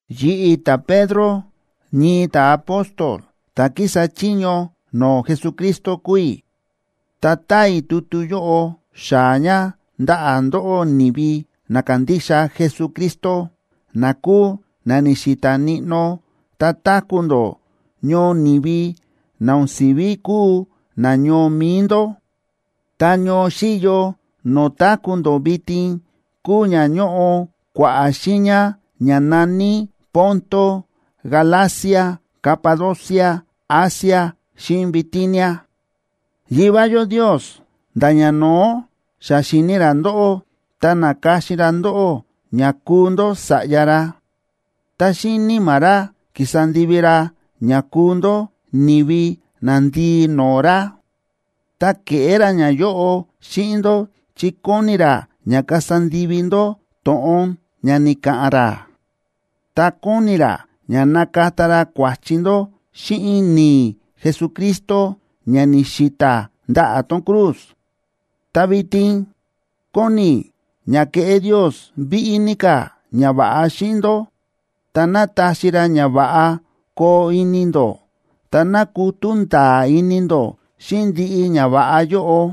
Yi̱ꞌi̱, ta̱Pedro, ñii ta̱apóstol ta̱ kísa chiño no̱o̱ Jesucristo kúu i̱. Ta táa i̱ tutu yóꞌo xaa̱ ña ndaꞌa̱ ndóꞌó, ni̱vi na kándixa Jesucristo, na kúu na ni̱xi̱ta̱ níꞌnó ta táku̱ ndó ñoo ni̱vi na o̱n si̱ví kúu nañoo mi̱i ndó. Ta ñoo xíyo no̱o̱ táku̱ ndó vitin kúu ña ñóꞌo kua̱ꞌa̱ xiiña ña na̱ní Ponto, Galacia, Capadocia, Asia xíꞌin Bitinia. Yivá yó Ndios nda̱ ñano̱ó xa xíni̱ ra ndóꞌó ta na̱ka̱xin ra ndóꞌó ña kuu ndó sa̱ꞌya ra. Ta xíꞌin Níma̱ ra ki̱sa ndivi ra ña kuu ndó ni̱vi nandii no̱o̱ ra. Ta ke̱ꞌé ra ñayóꞌo xíꞌin ndó chi kóni ra ña kasa ndivi ndó to̱ꞌon ña ni̱ka̱ꞌa̱n ra, ta kóni ra ña nakata ra kua̱chi ndó xíꞌin ni̱i̱ Jesucristo ña ni̱xi̱ta̱ ndaꞌa̱ tón cruz. Ta vitin kóni i̱ ña keꞌé Ndios víꞌí ní ka̱ ñava̱ꞌa xíꞌin ndó, ta ná taxi ra ña va̱ꞌa koo ini ndó. Ta ná kutú nda̱a̱ ini ndó xíꞌin ndiꞌi ñava̱ꞌa yóꞌo.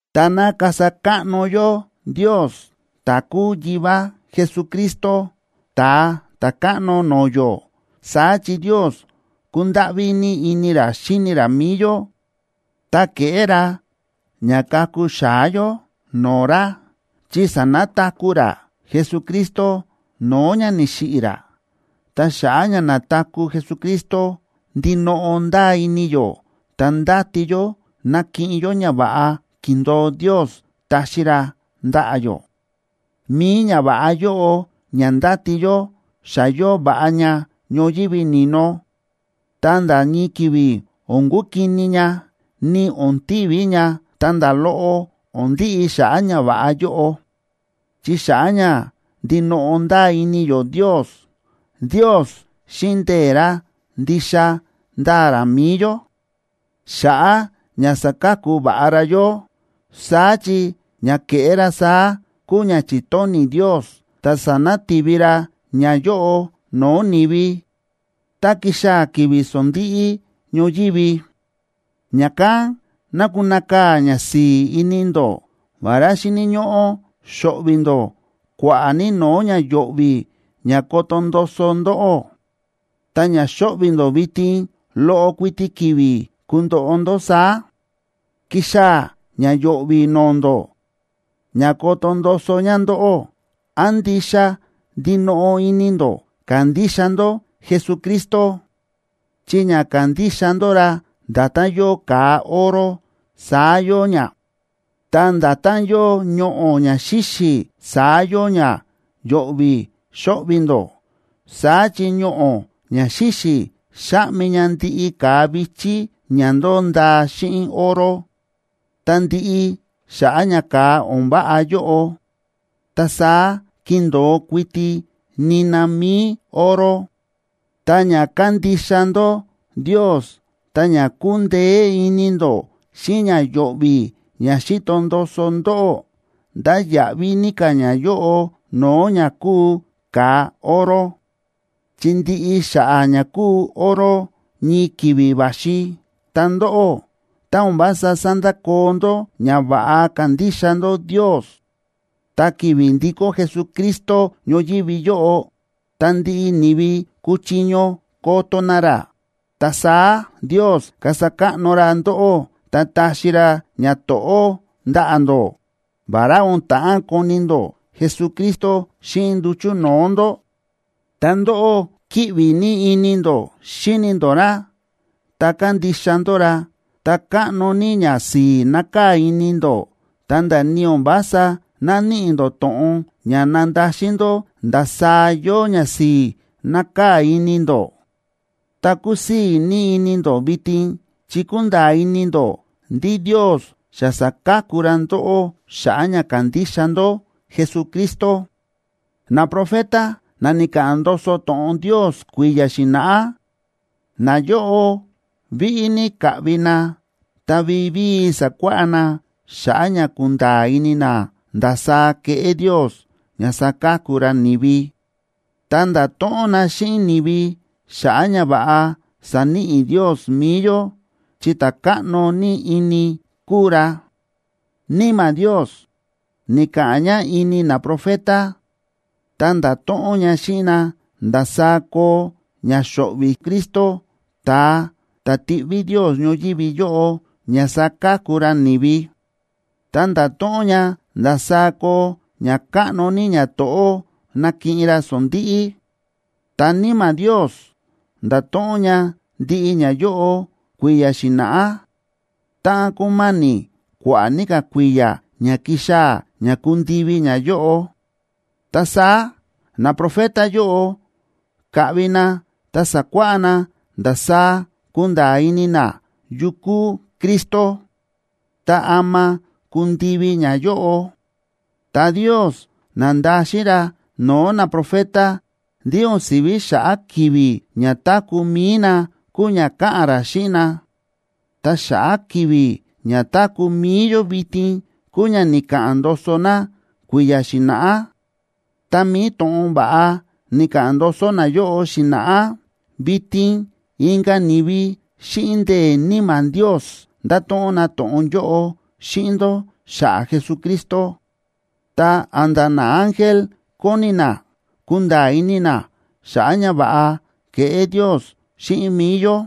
Ta ná kasa káꞌno yó Ndios, ta̱ kúu Yivá Jesucristo, Ta̱a Ta̱káꞌno no̱o̱ yó. Saá chi Ndios kúndáꞌví ní ini ra xíni ra mi̱i yó, ta ke̱ꞌé ra ña ka̱ku xa̱á yó no̱o̱ ra, chi sa̱nataku̱ ra Jesucristo no̱o̱ ña ni̱xiꞌi̱ ra. Ta xa̱ꞌa̱ ña na̱taku̱ Jesucristo, ndinoꞌo ndáa ini yó ta ndáti yó nakiꞌin yó ñava̱ꞌa ki̱ndo̱o Ndios taxi ra ndaꞌa̱ yó. Mi̱i ñava̱ꞌa yóꞌo ña ndáti yó xa yóo va̱ꞌa ña ñoyívi ni̱no, ta nda̱ ñii ki̱vi̱ o̱n kukini ña, ni o̱n tiví ña, ta nda̱ loꞌo o̱n ndiꞌi xa̱ꞌa̱ ñava̱ꞌa yóꞌo. Chi xa̱ꞌa̱ ña ndinoꞌo ndáa ini yó Ndios, Ndios xíꞌin ndee̱ ra ndixa ndáa ra mi̱i yó, xa̱ꞌa̱ ña saka̱ku va̱ꞌa ra yó. Saá chi ña keꞌé ra saá kúu ña chi̱tóni̱ Ndios, ta sanati̱vi ra ñayóꞌo no̱o̱ ni̱vi tá kixaa̱ ki̱vi̱ sondíꞌí ñoyívi. Ña̱kán ná kunakaa̱ ñasi̱i̱ ini ndó, vará xíni̱ ñóꞌó xo̱ꞌvi̱ ndó kua̱ꞌa̱ ní no̱o̱ ña yo̱ꞌvi̱ ña koto ndoso ndóꞌó, ta ña xóꞌvi̱ ndó vitin loꞌo kuiti ki̱vi̱ kundoꞌo ndó saá. Ki̱xaa̱ ña yo̱ꞌvi̱ no̱o̱ ndó ña koto ndoso ña ndóꞌó án ndixa ndinoꞌo ini ndó kándixa ndó Jesucristo, chi ña kándixa ndó ra nda̱tán yóo ka̱a oro, saá yóo ña. Ta nda̱tán yóo ñoꞌo̱ ña xíxi̱, saá yóo ña yo̱ꞌvi̱ xóꞌvi̱ ndó, saá chi ñoꞌo̱ ña xíxi̱ xáꞌmi ña ndiꞌi ka̱a vi̱chí ña ndo̱o ndaa xíꞌin oro, ta ndiꞌi xa̱ꞌa̱ ña ka̱a o̱n váꞌa yóꞌo, ta saá kindo̱o kuiti nina mi̱i oro. Ta ña kándixa ndó Ndios ta ña kúndeé ini ndó xíꞌin ña yo̱ꞌvi̱ ña xíto ndoso ndóꞌó, ndáya̱ꞌví ní ka̱ ñayóꞌo no̱o̱ ña kúu ka̱a oro, chi ndiꞌi xa̱ꞌa̱ ña kúu oro ñii ki̱vi̱ va̱xi. Ta ndóꞌó, tá o̱n vása sandakoo ndó ña va̱ꞌa kándixa ndó Ndios, ta ki̱vi̱ ndikó Jesucristo ñoyívi yóꞌo ta ndiꞌi ni̱vi kuchiño koto na ra, ta saá Ndios kasa káꞌno ra ndóꞌó, ta taxi ra ñato̱ꞌó ndaꞌa̱ ndó. Vará o̱n ta̱ꞌán koni ndó Jesucristo xíꞌin nduchu̱ no̱o̱ ndó, ta ndóꞌó kíꞌvi ní ini ndó xíni ndó ra, ta kándixa ndó ra. Ta káꞌno ní ñasi̱i̱ nákaa̱ ini ndó, ta̱nda̱ ni o̱n vása náníꞌi ndó to̱ꞌon ña nandaxin ndó ndasaá yóo ñasi̱i̱ nákaa̱ ini ndó. Ta kúsii̱ ní ini ndó vitin chi kúnda̱a̱ ini ndó ndí Ndios xa sa̱ka̱ku ra ndóꞌó xa̱ꞌa̱ ña kándixa ndó Jesucristo. Naprofeta na ni̱ka̱ꞌa̱n ndoso to̱ꞌon Ndios kui̱ya̱ xi̱na̱ꞌá, nayóꞌo víꞌí ní ka̱ꞌvi na ta vivíi sa̱kuáꞌá na xa̱ꞌa̱ ña kunda̱a̱ ini na ndasaá keꞌé Ndios ña saka̱ku ra ni̱vi. Ta nda̱to̱ꞌon na xíꞌin ni̱vi xa̱ꞌa̱ ñava̱ꞌa saníꞌi Ndios mi̱i yó chi ta̱ káꞌno ní ini kúu ra. Níma̱ Ndiosa ni̱ka̱ꞌa̱n ña ini naprofeta, ta nda̱to̱ꞌon ña xíꞌin na ndasaá koo ña xo̱ꞌvi̱ Cristo, ta̱a ta̱ tiꞌví Ndios ñoyívi yóꞌo ña saka̱ku ra ni̱vi, ta nda̱to̱ꞌon ña ndasaá koo ña káꞌno ní ñato̱ꞌó nakiꞌin ra sondi̱ꞌi. Ta Níma̱ Ndios nda̱to̱ꞌon ña ndiꞌi ñayóꞌo kui̱ya̱ xi̱na̱ꞌá, táꞌan kúma̱ni̱ kua̱ꞌa̱ ní ka̱ kui̱ya̱ ña kixaa̱ ña kundivi ñayóꞌo. Ta saá naprofeta yóꞌo ka̱ꞌvi na ta sa̱kuáꞌá na ndasaá kunda̱a̱ ini na yu kuu Cristo, ta ama kundivi ñayóꞌo. Ta Ndios na̱ndaxin ra no̱o̱ naprofeta ndí o̱n si̱ví xa̱ꞌa̱ ki̱vi̱ ña táku̱ mi̱i na kúu ña káꞌa̱n ra xíꞌin na, ta xa̱ꞌa̱ ki̱vi̱ ña táku̱ mi̱i yó vitin kúu ña ni̱ka̱ꞌa̱n ndoso na kui̱ya̱ xi̱na̱ꞌá. Ta mi̱i to̱ꞌon va̱ꞌa ni̱ka̱ꞌa̱n ndoso nayóꞌo xi̱na̱ꞌá, vitin inka̱ ni̱vi xíꞌin ndee̱ Níma̱ Ndios nda̱to̱ꞌon na to̱ꞌon yóꞌo xíꞌin ndó xa̱ꞌa̱ Jesucristo. Ta a̱nda̱ naángel kóni na kunda̱a̱ ini na xa̱ꞌa̱ ñava̱ꞌa ke̱ꞌé Ndios xíꞌin mi̱i yó.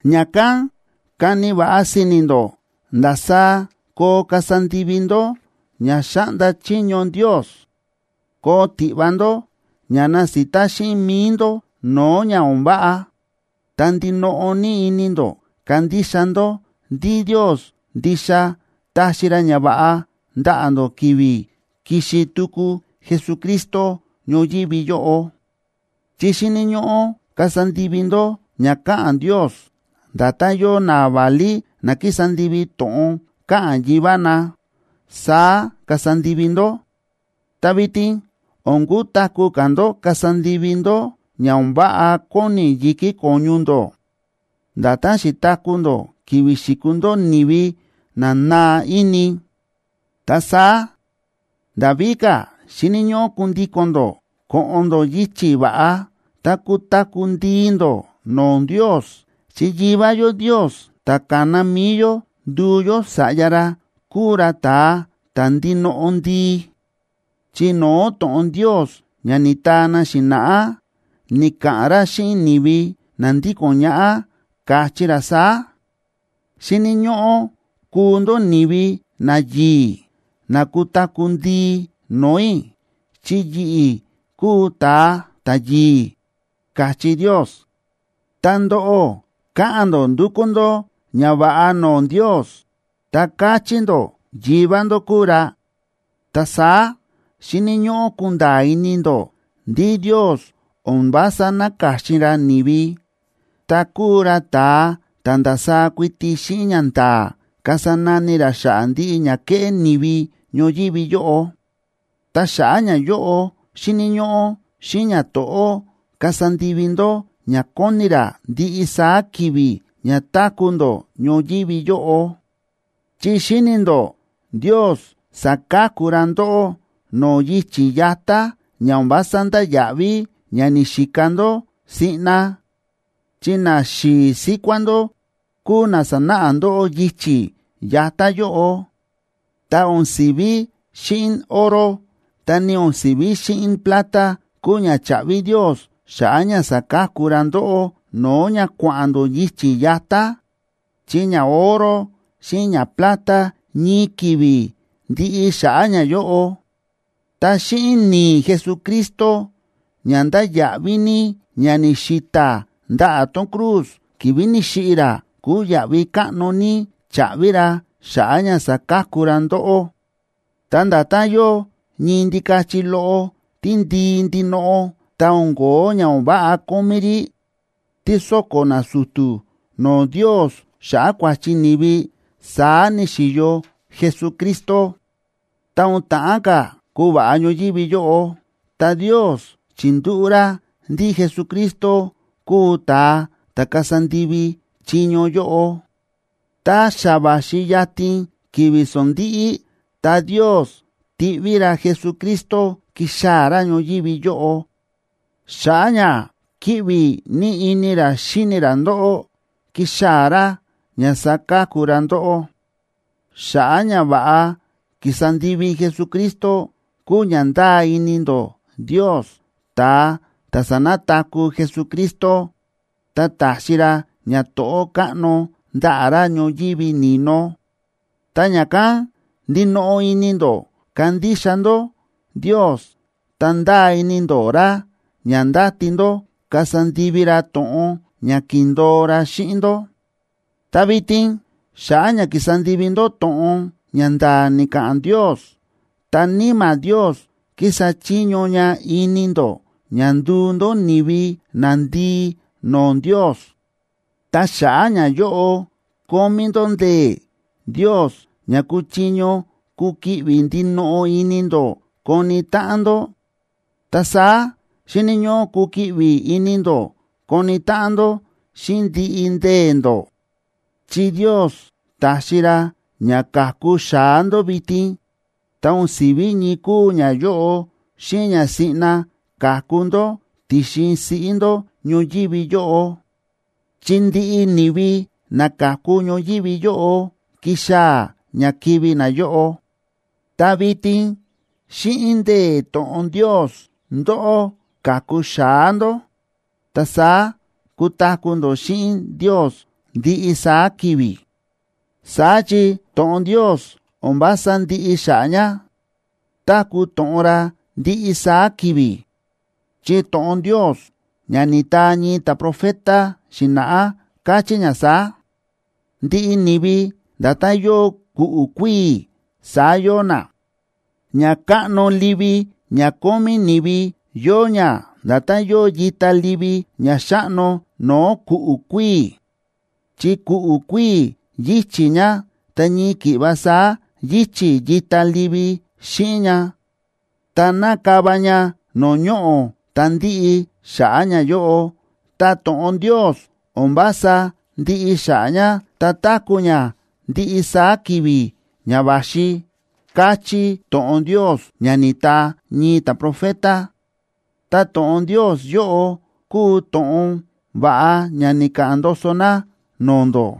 Ña̱kán kani va̱ꞌa si̱ni̱ ndó ndasaá koo kasa ndivi ndó ña xáꞌnda chiño Ndios. Koo tiꞌva ndó ña nasita xíꞌin mi̱i ndó no̱o̱ ña o̱n váꞌa, ta ndinoꞌo ní ini ndó kandixa ndó ndí Ndios ndixa taxi ra ñava̱ꞌa ndaꞌa̱ ndó ki̱vi̱ kixi tuku Jesucristo ñoyívi yóꞌo. Chi xíni̱ ñóꞌó kasa ndivi ndó ña káꞌa̱n Ndios, nda̱tán yóo naválí na kísa ndivi to̱ꞌon káꞌa̱n yivá na, saá kasa ndivi ndó. Ta vitin o̱n kutaku̱ ka̱ ndó kasa ndivi ndó ña o̱n váꞌa kóni yi̱kí ko̱ñu ndó, nda̱tán xi̱taku̱ ndó ki̱vi̱ xi̱kuu ndó ni̱vi na naa ini. Ta saá nda̱ víka̱ xíni̱ ñóꞌó kundíko̱n ndó ko̱ꞌo̱n ndó yichi̱ va̱ꞌa, ta kutaku̱ ndii ndó no̱o̱ Ndios, chi Yivá yó Ndios ta̱ ka̱na mi̱i yó nduu yó sa̱ꞌya ra, kúu ra ta̱a ta̱ ndinoꞌo ndii. Chi no̱o̱ to̱ꞌon Ndios ña ni̱taa na xi̱na̱ꞌá, ni̱ka̱ꞌa̱n ra xíꞌin ni̱vi na ndíko̱n ñaꞌá, káchí ra saá: “Xíni̱ ñóꞌó kuu ndó ni̱vi nayi̱i̱ na kutaku̱ ndii no̱o̱ i̱, chi yi̱ꞌi̱ kúu ta̱a ta̱yi̱i̱”, káchí Ndios. Ta ndóꞌó káꞌa̱n ndó ndúkú ndó ñava̱ꞌa no̱o̱ Ndios, ta káchí ndó Yivá ndó kúu ra, ta saá, xíni̱ ñóꞌó kunda̱a̱ ini ndó ndí Ndios o̱n vása na̱ka̱xin ra ni̱vi, ta kúu ra ta̱a ta̱ ndasaá kuiti xíꞌin ñanda̱a̱ kasa nani ra xa̱ꞌa̱ ndiꞌi ña kéꞌé ni̱vi ñoyívi yóꞌo, ta xa̱ꞌa̱ ñayóꞌo xíni̱ ñóꞌó xíꞌin ñato̱ꞌó kasa ndivi ndó ña kóni ra ndiꞌi saá ki̱vi̱ ña táku̱ ndó ñoyívi yóꞌo. Chi xíni̱ ndó Ndios sa̱ka̱ku ra ndóꞌó no̱o̱ yichi̱ yatá ña o̱n vása ndáya̱ꞌví ña ni̱xika ndó siꞌna, chi naxi̱i̱ síkuá ndó kúu na sa̱náꞌa ndóꞌó yichi̱ yatá yóꞌo. Ta o̱n si̱ví xíꞌin oro ta ni o̱n si̱ví xíꞌin plata, kúu ña cha̱ꞌvi Ndios xa̱ꞌa̱ ña sa̱ka̱ku ra ndóꞌó no̱o̱ ña kua̱ꞌa̱n ndó yichi̱ yatá, chi ñaoro xíꞌin ñaplata ñii ki̱vi̱ ndiꞌi xa̱ꞌa̱ ñayóꞌo. Ta xíꞌin ni̱i̱ Jesucristo ña ndáya̱ꞌví ní ña ni̱xi̱ta̱ ndaꞌa̱ tón cruz ki̱vi̱ ni̱xiꞌi̱ ra, kúu yaꞌvi káꞌno ní cha̱ꞌvi ra xa̱ꞌa̱ ña saka̱ku ra ndóꞌó. Ta nda̱tán yóo ñii ndikachi loꞌo tíndii ndinoꞌo, ta o̱n ko̱ó ña o̱n váꞌa kómí rí, tí sóko̱ nasu̱tu̱ no̱o̱ Ndios xa̱ꞌa̱ kua̱chi ni̱vi, saá ni̱xi̱yo Jesucristo. Ta o̱n ta̱ꞌán ka̱ kuva̱ꞌa ñoyívi yóꞌo, ta Ndios chi̱ndúꞌu̱ ra ndí Jesucristo kuu ta̱a ta̱ kasa ndivi chiño yóꞌo. Tá xa va̱xi yatin ki̱vi̱ sondíꞌí, ta Ndios ti̱ꞌví ra Jesucristo ki̱xaa̱ ra ñoyívi yóꞌo. Xa̱ꞌa̱ ña kíꞌvi ní ini ra xíni ra ndóꞌó, ki̱xaa̱ ra ña saka̱ku ra ndóꞌó. Xa̱ꞌa̱ ñava̱ꞌa ki̱sa ndivi Jesucristo kúu ña ndáa ini ndó Ndios, ta̱a ta̱ sa̱nataku̱ Jesucristo, ta ta̱xi ra ñato̱ꞌó káꞌno ndaꞌa̱ ra ñoyívi ni̱no. Ta ña̱kán ndinoꞌo ini ndó kándixa ndó Ndios, ta ndáa ini ndó ra ña ndáti ndó kasa ndivi ra to̱ꞌon ña ki̱ndo̱o ra xíꞌin ndó. Ta vitin xa̱ꞌa̱ ña kísa ndivi ndó to̱ꞌon ña nda̱a̱ ni̱ka̱ꞌa̱n Ndios, ta Níma̱ Ndios kísa chiño ña ini ndó ña nduu ndó ni̱vi nandii no̱o̱ Ndios. Ta xa̱ꞌa̱ ñayóꞌo kómí ndó ndee̱ Ndios ña kúchiño kukiꞌvi ndinoꞌo ini ndó koni táꞌan ndó. Ta saá xíni̱ ñóꞌó kukiꞌvi ini ndó koni táꞌan ndó xíꞌin ndiꞌi ndee̱ ndó. Chi Ndios ta̱xi ra ña ka̱ku xa̱á ndó vitin, ta o̱n si̱ví ñii kúu ñayóꞌo xíꞌin ña siꞌna ka̱ku ndó ti̱xin siꞌí ndó ñoyívi yóꞌo, chi ndiꞌi ni̱vi na ka̱ku ñoyívi yóꞌo kixaa̱ ña kivi̱ nayóꞌo. Ta vitin xíꞌin ndee̱ to̱ꞌon Ndios ndóꞌó ka̱ku xa̱á ndó, ta saá kutaku̱ ndó xíꞌin Ndios ndiꞌi saá ki̱vi̱. Saá chi to̱ꞌon Ndios o̱n vása ndiꞌi xa̱ꞌa̱ ña, táku̱ to̱ꞌon ra ndiꞌi saá ki̱vi̱. Chi to̱ꞌon Ndios, ña ni̱taa ñii ta̱profeta xi̱na̱ꞌá, káchí ña saá: Ndiꞌi ni̱vi nda̱tán yóo ku̱ꞌu̱ kuíi̱, saá yóo na. Ñakáꞌno livi ña kómí ni̱vi, yóo ña nda̱tán yóo yita livi ña xáꞌno no̱o̱ ku̱ꞌu̱ kuíi̱. Chi ku̱ꞌu̱ kuíi̱ yíchi̱ ña, ta ñii ki̱ꞌva saá yíchi̱ yita livi xíꞌin ña, ta nakava ña no̱o̱ ñoꞌo̱ ta ndiꞌi xa̱ꞌa̱ ñayóꞌo; ta to̱ꞌon Ndios, o̱n vása ndiꞌi xa̱ꞌa̱ ña, ta táku̱ ña ndiꞌi saá ki̱vi̱ ña va̱xi, káchí to̱ꞌon Ndios ña ni̱taa ñii ta̱profeta. Ta to̱ꞌon Ndios yóꞌo, kúu to̱ꞌon va̱ꞌa ña ni̱ka̱ꞌa̱n ndoso na no̱o̱ ndó.